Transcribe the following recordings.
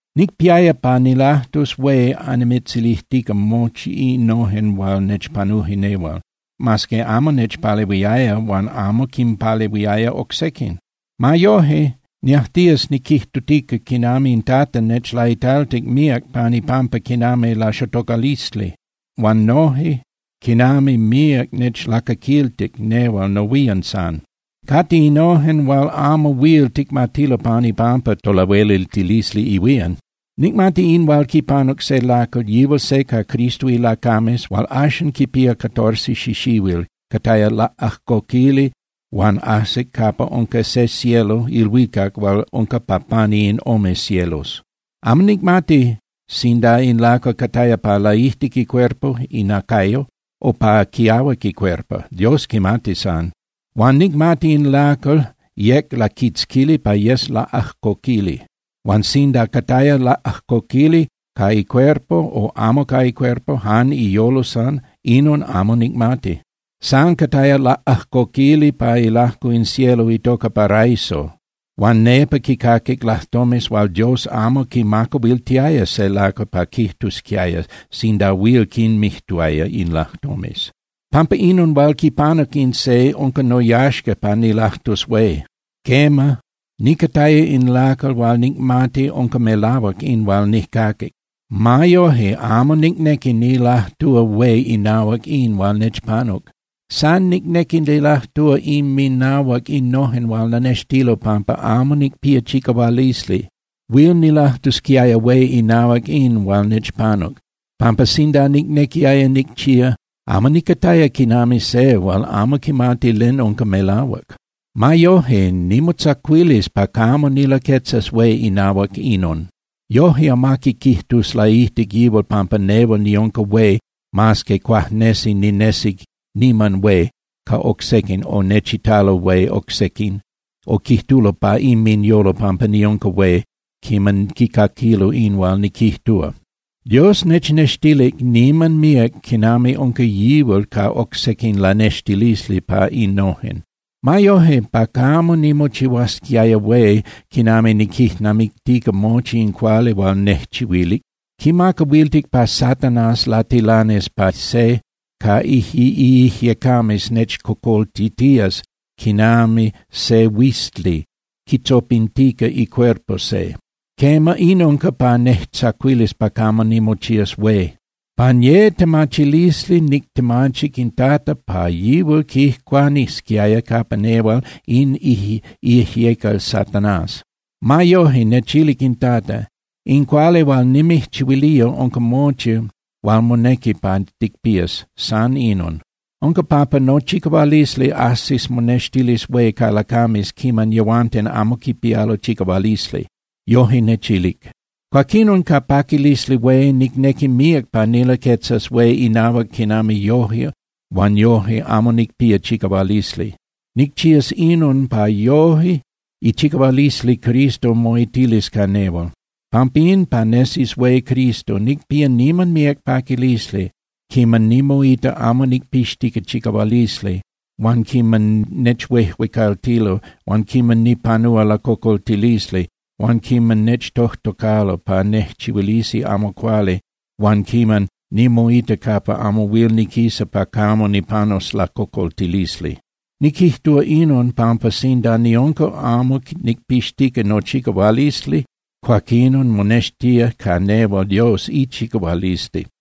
Nicpiaya pa nilajtus hué annimitzilijtica mochi innojen hual nechpanuje nehual, mas que amo nechpalehuiaya huan amo quimpalehuiaya oc sequin. Ma yoje, niajtías niquijtutica quinami in Tata nechlaitaltic míac pan ipampa quinami laxotocalisli, huan noje quinami míac nechlacaquiltic nehual nohuían san. Cate innojen hual amo huil ticmatilo pan ipampa tolahueliltilisli ihuían. Nicmati in hual quipanuc se lacal, yihual se ca Cristo ilacames hual axan quipía catorce xixihuil, cataya laꞌajcoquili huan ajsic capa unca se cielo (ilhuicac) hual unca pa pani in ome cielos. Amo nicmati sinda in lacal cataya pa laijtic icuerpo (inacayo) o pa quiahuac icuerpo. Dios quimati san. Huan nicmati in lacal yec laquitzquili pa yes laꞌajcoquili. Huan sinda cataya laꞌajcoquili ca icuerpo o amo ca icuerpo, jan iyolo san, inon amo nicmati. San cataya laꞌajcoquili pa ilajco in cielo itoca paraiso huan nepa quicaquic lajtomes hual Dios amo quimacahuiltiaya se lacal pa quijtusquiaya sinda huil quinmijtuaya in lajtomes. Pampa inon hual quipanuc in se unca noyaxca pa nilajtus hué. Quema, nicataya in lacal huan nicmati unca melahuac in hual nijcaquic. Ma yoje, amo nicnequi nilajtúa hué inahuac in hual nechpanuc. San nicnequi nilajtúa inminahuac innojen hual lanextilo pampa amo nicpía chicahualisli. Huil nilajtusquiaya hué inahuac in hual nechpanuc, pampa sinda nicnequiaya nicchía, amo nicataya quinami se hual amo quimati len unca melahuac. Ma yoje, nimotzacuilis pa camo nilaquetzas hué inahuac inon. Yoje amaqui quijtus laijtic yihual pampa nehual niunca hué mas que cuajnesi ninesi niman hué ca oc sequin o nechitalo hué oc sequin o quijtulo pa inminyolo pampa niunca hué quiman quicaquilo in hual niquijtúa. Dios nechnextilic niman míac quinami unca yihual ca oc sequin lanextilisli pa innojen. Ma yoje, pa camo nimochihuasquiaya hué quiman niquijnamictica mochi in cuali hual nejchihuilic, quimacahuiltic pa Satanás latilanis pa se ca iijyecames nechcocoltitías quinami se huizli quitzopintica icuerpo se. Quema, in unca pa nejtzacuilis pa camo nimochías hué. Pan ye latemachilisli nictemachic in Tata pa yihual quijcuanisquiaya capa nehual in iijyecal Satanás. Ma yoje, nechilic in Tata: “In cuali hual nimijchihuilía unca mochi hual monequi pa ticpías, san inon. Unca pampa nochicahualisli ajsis monextilis hué ca lacames quiman yehuanten amo quipialo chicahualisli.” Yoje nechilic. Cuaquinon, ca paquilisli hué, nicnequi míac pa nilaquetzas hué inahuac quinami yoje huan yoje amo nicpía chicahualisli. Nicchías inon, pa yojque ichicahualisli Cristo moitilis ca nehual. Pampín, pa nesis hué Cristo, nicpía niman míac paquilisli quiman nimoita amo nicpixtica chicahualisli huan quiman nechuejuecaltilo huan quiman nipanúa lacocoltilisli huan quiman nechtojtocalo pa nejchihuilisi amo cuali huan quiman nimoita capa amo huil niquisa pa camo nipanus lacocoltilisli. Niquijtúa inon pampa sinda niunca amo nicpixtica nochicahualisli, cuaquinon monextía ca nehual Dios ichicahualisli.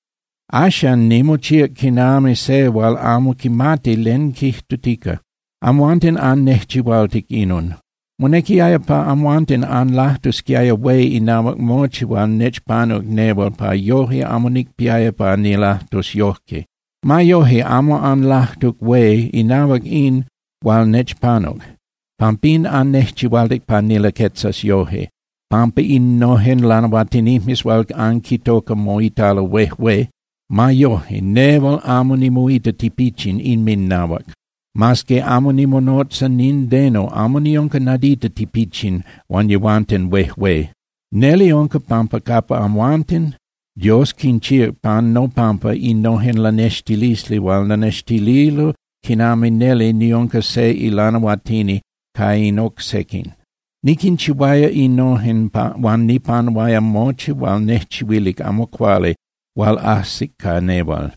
Axan, nimochíac quinami se hual amo quimati len quijtutica. Amhuanten annejchihualtic inon. Monequiaya pa amhuanten anlajtusquiaya hué inahuac mochi hual nechpanuc nehual pa yoje amo nicpiaya pa nilajtus yojque. Ma yoje, amo anlajtuc hué inahuac in hual nechpanuc. Pampín annejchihualtic pa nilaquetzas yoje, pampa innojen lanahuatinijmes hual anquintoca moitalo huejué. Ma yoje, nehual amo nimoita tipichin inminnahuac. Mas que amo nimonotza nindeno, amo niunca nadita tipichin huan yehuanten huejué. Neli unca pampa capa amhuanten, Dios quinchíac pan nopampa innojen lanextilisli hual lanextililo quinami neli niunca se ilanahuatini ca in oc sequin. Niquinchihuaya innojen huan nipanuaya mochi hual nejchihuilic amo cuali hual ajsic ca nehual.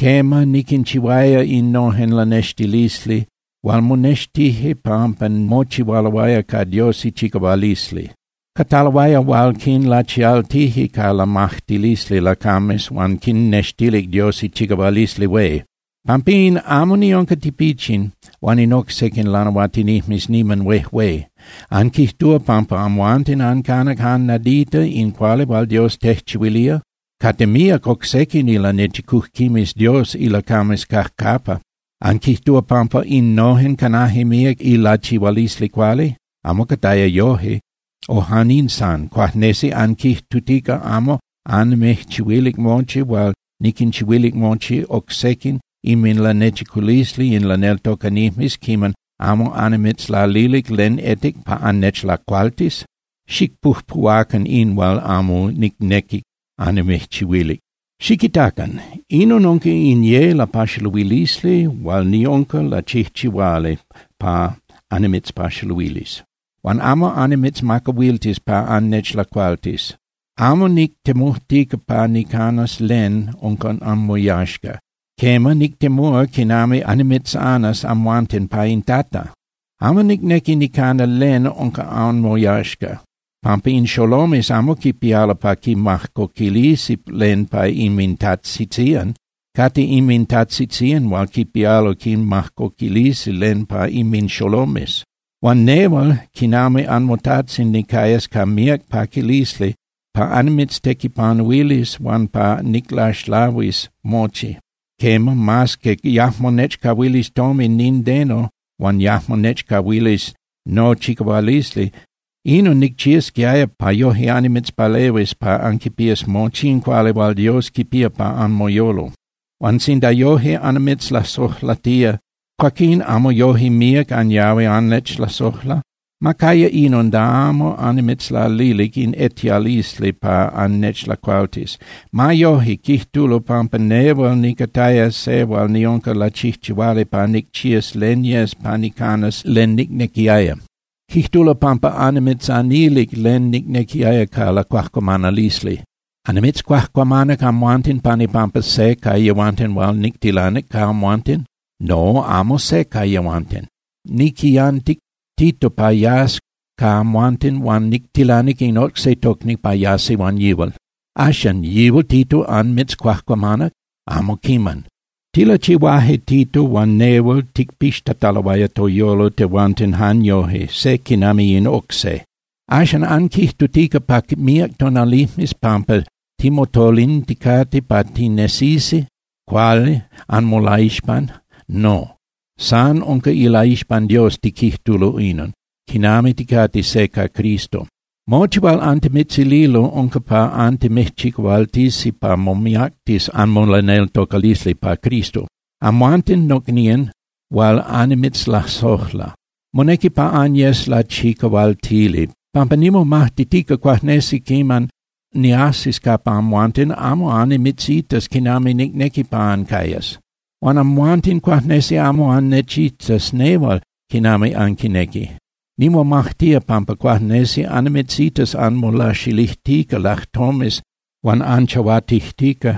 Quema, niquinchihuaya innojen lanextilisli hual monextije pampa mochihualoaya ca Dios ichicahualisli. Cataloaya hual quinlachialtije ca lamajtilisli lacames huan quinnextilic Dios ichicahualisli hué. Pampín, amo niunca tipichin huan in oc sequin lanahuatinijmes niman huejué. ¿Anquijtúa pampa amhuanten ancanac jan nadita in cuali hual Dios tejchihuilía? Cate míac oc sequin ilanechicujquimes Dios ilacames cajcapa. ¿Anquijtúa pampa innojen canaje míac ilachihualisli cuali? Amo cataya yoje. O jan in san, ¿cuajnesi anquijtutica amo annimijchihuilic mochi hual niquinchihuilic mochi oc sequin inminlanechiculisli in laneltocanijmes quiman amo annimitzlalilic len etic pa annechlacualtis? ¡Xicpujpuhuacan in hual amo nicnequic annimijchihuilic! Xiquitacan. Inon unca in ye lapaxaluilisli hual niunca lachijchihuali pa annimitzpaxaluilis. Huan amo annimitzmacahuiltis pa annechlacualtis. Amo nictemujtica pa nicanas len unca anmoyaxca. Quema, nictemúa quinami annimitzanas amhuanten pa in Tata. Amo nicnequi nicana len unca anmoyaxca, pampa in xolomes amo quipialo pa quinmajcoquilisi len pa inmintajtzitzían. Cate inmintajtzitzían hual quipialo quinmajcoquilisi len pa inminxolomes. Huan nehual quinami anmotajtzin nicayas ca míac paquilisli pa annimitztequipanuilis huan pa niclaxlahuis mochi, quema, mas que yajmo nechcahuilis tomin nindeno huan yajmo nechcahuilis nochicahualisli. Inon nicchiasquiaya pa yoje annimitzpalehuis pa anquipías mochi in cuali hual Dios quipía pa anmoyolo. Huan sinda yojque annimitzlasojlatía, cuaquín ¿amo yoje míac anyahui annechlasojla? Ma caya inon da amo annimitzlalilic in etialisli pa annechlacualtis. Ma yoje, quijtulo pampa nehual nicataya se hual niunca lachijchihuali pa nicchías len yes pa nicanas len nicnequiaya. Quijtulo pampa annimitzanilic len nicnequiaya ca lacuajcuamanalisli. ¿Annimitzcuajcuamanac amhuanten pan ipampa se ca yehuanten hual nictilanic ca amhuanten? No, amo se ca yehuanten. Niquiyantic Tito pa yas ca amhuanten huan nictilanic in oc se tocni pa yasi huan yihual. Axan, ¿yihual Tito anmitzcuajcuamanac? Amo quiman. Tilachihuaje Tito huan nehual ticpixtataloaya toyolo tehuanten jan yoje, se quinami in oc se. ¿Axan anquijtutica pa míac tonalijmes pampa timotolinticate pa tinesisi cuali anmolaixpan? No. San unca ilaixpan Dios tiquijtulo inon, quinami ticate se ca Cristo. Mochi hual antimitzililo unca pa antimijchicahualtisi pa momiactis anmolaneltocalisli pa Cristo, amhuanten nocnían hual annimitzlasojla. Monequi pa anyes lachicahualtili, pampa nimomajtitica cuajnesi quiman niajsis capa amhuanten, amo annimitzitas quinami nicnequi pa ancayas. Huan amhuanten cuajnesi amo annechitas nehual quinami anquinequi. Nimomajtía pampa cuajnesi annimitzitas anmolaxilijtica lajtomes huan anchahuatijtica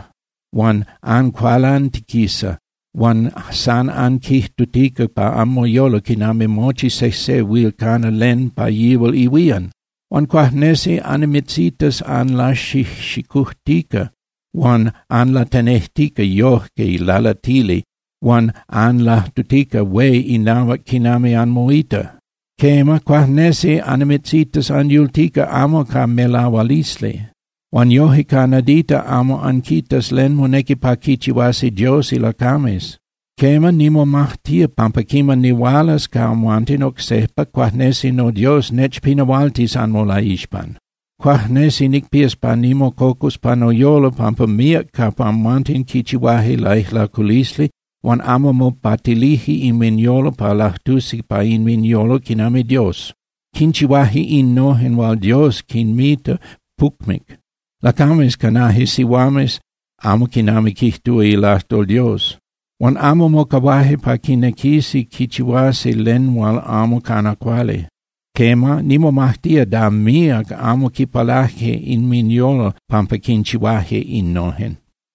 huan ancualantiquisa huan san anquijtutica pa anmoyolo quinami mochi sejse huil cana len pa yihual ihuían. Huan cuajnesi annimitzitas anlaxijxicujtica huan anlatenejtica yoje lalatili huan anlajtutica hué inahuac quinami anmoita. Quema, cuajnesi annimitzitas anyultica amo ca melahualisli. Huan yoje ca nadita amo anquitas len monequi pa quichihuasi Dios ilacames. Quema, nimomajtía pampa quiman nihualas ca amhuanten oc sejpa, cuajnesi noDios nechpinahualtis anmolaixpan. Cuajnesi nicpías pa nimococus pa noyolo pampa míac capa amhuanten quichihuaje laijlaculisli huan amo mopatilije inminyolo pa lajtusi pa inminyolo quinami Dios. Quinchihuaje innojen hual Dios quinmita pucmic. Lacames canaje sihuames amo quinami quijtúa ilajtol Dios. Huan amo mocahuaje pa quinequisi quichihuasi len hual amo cana cuali. Quema, nimomajtía da míac amo quipalaje inminyolo pampa quinchihuaje innojen.